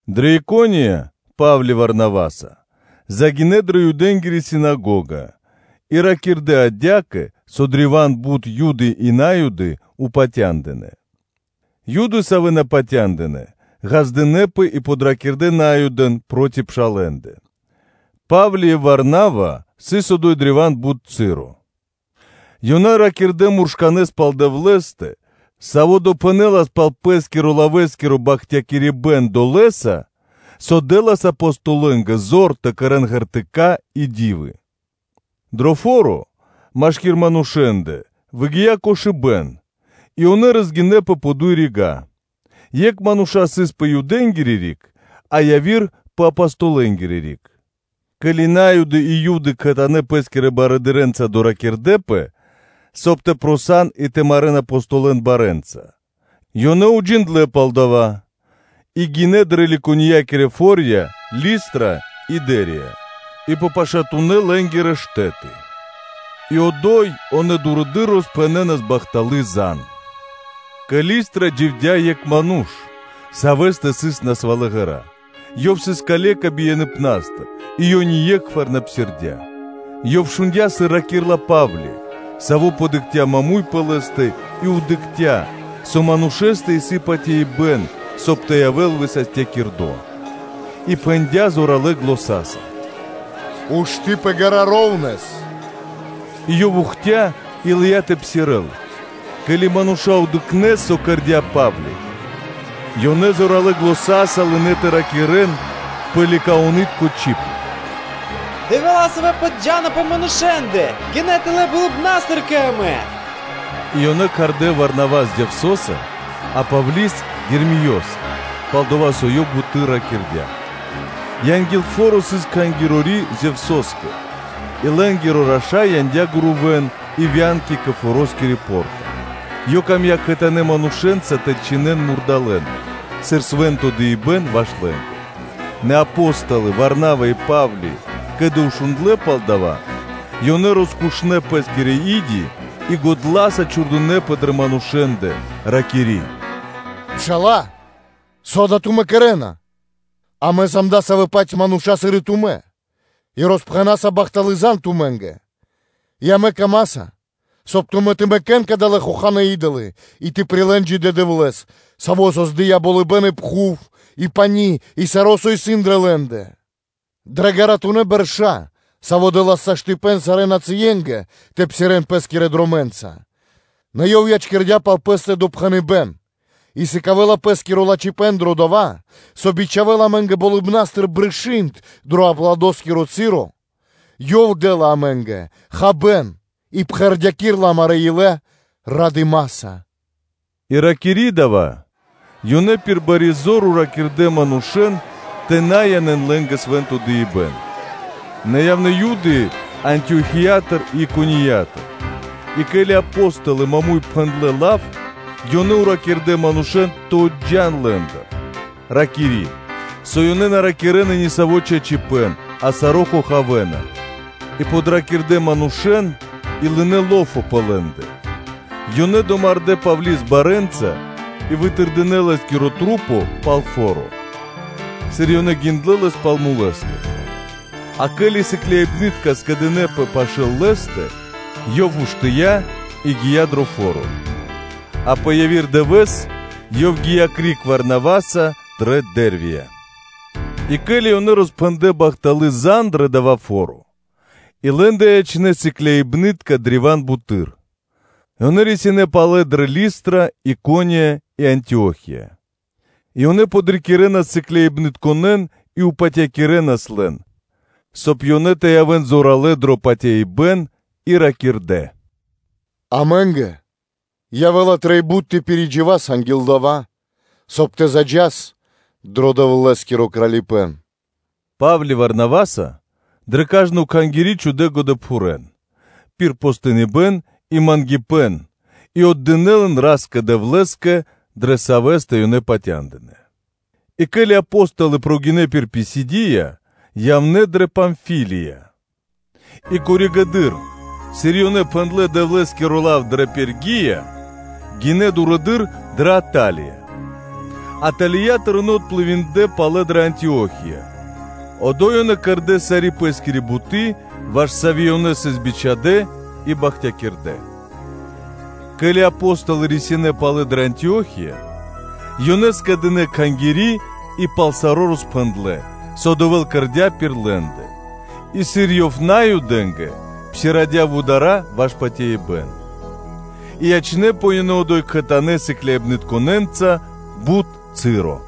Дрэ Икония Па́вли Варнаваса загинэ́ дрэ Юдэнгири синагога и ракирдэ́ адя́кэ, со древа́н бут Юды и На́юды патяндынэ́. Нэ Юды, савэ́ на патяндынэ́, ґаздынэ́пэ и подракирдэ Наюдэн проти пшалэ́ндэ. Па́вли и Варнава сыс одо́й древа́н бут часо, ёнэ ракирдэ́ муршканэ́с пал Дэвлэ́стэ, Саво́ допхэнэлас пал Пэ́скирэ-лавэскиро бахтякирибэ́н долэса, со дэ́лас Апостолэнгэ зор тэ кэрэ́н знаме́нии (ґертыка́) и ди́вы. Дрэ фо́ро машки́р манушэ́ндэ выгия́ кошыбэ́н и ёнэ розгинэпэ пэ дуй рига́, екх мануша́ сыс пэ Юдэнгири риг, а яви́р мануша́ пэ Апостолэнгири риг. Ке́ли На́юды и Юды кхэтанэ́ пэ́скирэ барыдырэ́нца доракирдэпэ; соб (кай) тэ ладжакирэн и тэ марэ́н Апостолэн барэ́нца, ёнэ уджиндлэ́ пал дава́ и гинэ́ дрэ Ликаоноскирэ [Ликониякирэ-ю.о.] фо́рья Листра и Дэрвия и пэ пашатунэ́ лэ́нгирэ штэ́ты; и одо́й ёнэ дурэды́р роспхэнэнас бахталы́ зан (звесь). Кэ Листра дживдя́ екх ману́ш, савэ́стэ сыс насвалэ ґэра́, ёв сыс калека бияныпнастыр и ёв ние́кхвар на псирдя́. Ёв шундя́, сыр ракирдя́ Па́вли, саво́ дыкхця сыгэс маму́й пэ лэ́стэ и дыкхця́, со манушэ́стэ исын патяибэ́н, соб (кай) тэ явэ́л высастякирдо, и пхэндя́ зоралэ́ заня́са: “Ушты́ пэ ґэра́ маму́й (ровнэс).” И ёв ухтя и лыя́ тэ псирэ́л. Ке́ли мануша́ дыкхнэ́, со кэрдя́ Па́вли, ёнэ зоралэ́ заня́са лынэ́ тэ ракирэ́н пэ Ликаонытко чиб: “Дэвэла́, савэ́ поджана (зджана) пэ манушэ́ндэ, гинэ́ тэлэ́ болыбна́стыр кэ амэ!” И ёнэ кхардэ́ Варнавос Зевсоса, а Павли́с Ермиёса, пал-дова́ со ёв буты́р ракирдя́. Анги́л фо́ро сыс кхангирори Зевсоскэ и лэ́нгиро раша́й яндя́ гурувэ́н и вянки кэ форо́скири по́рта, ёв камдя́ кхэтанэ́ манушэ́нца тэ чхинэн мурдалэ́н, сыр свэ́нто дыибэ́н ваш лэ́нгэ. Нэ Апо́столы Варнава и Па́вли, ке́ли шундлэ́ пал дава́, то ёнэ роскушнэ пэ́скирэ и́ди и годла́са чхурдынэпэ дрэ манушэ́ндэ, ракири́: “Мануша́лэ! Со тумэ́ кэрэ́на? Амэ сам дасавэ́-паць мануша́, сыр и тумэ́, и роспхэнаса бахталы́ зан тумэ́нгэ, и амэ камаса, соб (кай) тумэ́ тэ мэкэ́н кадалэ́ хоханэ́ и́долы и тэ прилэ́н джидэ́ Дэвлэ́с, Саво́ создыя́ болыбэ́н и пхув и пани́, и саро́, со исын дрэ лэ́ндэ; Саво́ дрэ ґаратунэ́ бэрша́, дэ́лас во́ля сарэ́ нацыенгэ тэ псирэ́н пэ́скирэ дромэ́нца. Нэ Ёв ячкирдя́ пал Пэ́стэ допхэныбэ́н и сыкавэ́ла Пэ́скиро лачхипэ́н дрэ дова́, со бичхавэ́ла амэ́нгэ болыбна́стыр брышы́нд дро аплодоскиро часо; Ёв дэ́ла амэ́нгэ хабэ́н и пхэрдякирэла амарэ́ илэ радыма́са” И ракири́ дава́, ёнэ пир бари зор патякирдэ́ манушэ́н тэ на янэ́н лэ́нгэ свэ́нто дыибэ́н. Нэ явнэ́ Юды Антиохиятыр и Икониятыр и, ке́ли Апо́столы маму́й (прямэс) пхэндлэ́ лав, ёнэ патякирдэ́ манушэ́н тэ отджан лэ́ндыр, ракири́, со ёнэ на ракирэ́на нисаво́ чачипэ́н, а саро́ хохавэна. И подракирдэ манушэ́н и лынэ́ лофо пэ лэ́ндэ: ёнэ домардэ́ Павли́с барэ́нца и вытырдынэ лэс пал фо́ро, сыр ёнэ гиндлэ́ лэс пал мулэстэ. А ке́ли сыкляибны́тка скэдынэ́пэ пашы́л лэ́стэ, ёв уштыя́ и гия́ дрэ фо́ро; а пэ яви́р дывэ́с ёв гия́ криг Варнаваса дрэ Дэрвия. И ке́ли ёнэ роспхэндлэ́ бахталы́ зан (звесь) дрэ дава́ фо́ро и лэ́ндэ ячнэ́ сыкляибны́тка древа́н буты́р, ёнэ рисинэ́ палэ дрэ Листра, Икония и Антио́хия, и ёнэ подрикирэнас сыкляибнытконэ́н и патякирэнас лэн, соб (кай) ёнэ тэ явэ́н зоралэ́ дро патяибэ́н и ракирдэ́: “Амэ́нгэ явэ́ла трэй бут тэ пиридживас анги́л дава́, соб (кай) тэ заджас дро Дэвлэ́скиро Кралипэ́н.” Па́вли Варнаваса дрэ кажно кхангири́ чхудэ́ годэпхурэн пир постиныбэн и мангипэ́н и отдынэ́ лэн Ра́скэ-Дэвлэ́скэ, дрэ Савэ́стэ ёнэ патяндынэ́. И ке́ли Апо́столы гинэ́ пир Писидия, ёнэ явнэ́ дрэ Памфилия. И коригэды́р, сыр ёнэ пхэндлэ́ Дэвлэ́скиро лав дрэ Пергия, то гинэ́ дурэды́р дрэ Аталия, Аталиятыр ёнэ отплывиндлэ (дынэ́ пли́ма криг) палэ дрэ Антио́хия, одо́й ёнэ кэрдэ́ сари́ пэ́скири буты́, ваш сави́ ёнэ сыс бичхадэ́ и бахтякирдэ. Ке́ли Апо́столы рисинэ́ палэ дрэ Антио́хия, ёнэ скэдынэ́ кхангири́, и пал саро́ роспхэндлэ́, со Дэвэ́л кэрдя́ пир лэ́ндэ, и сыр Ёв Наюдэ́нгэ псирадя вудара́ ваш патяибэ́н. И ячнэ́пэ ёнэ одо́й кхэтанэ́ сыкляибнытконэ́нца бут часо.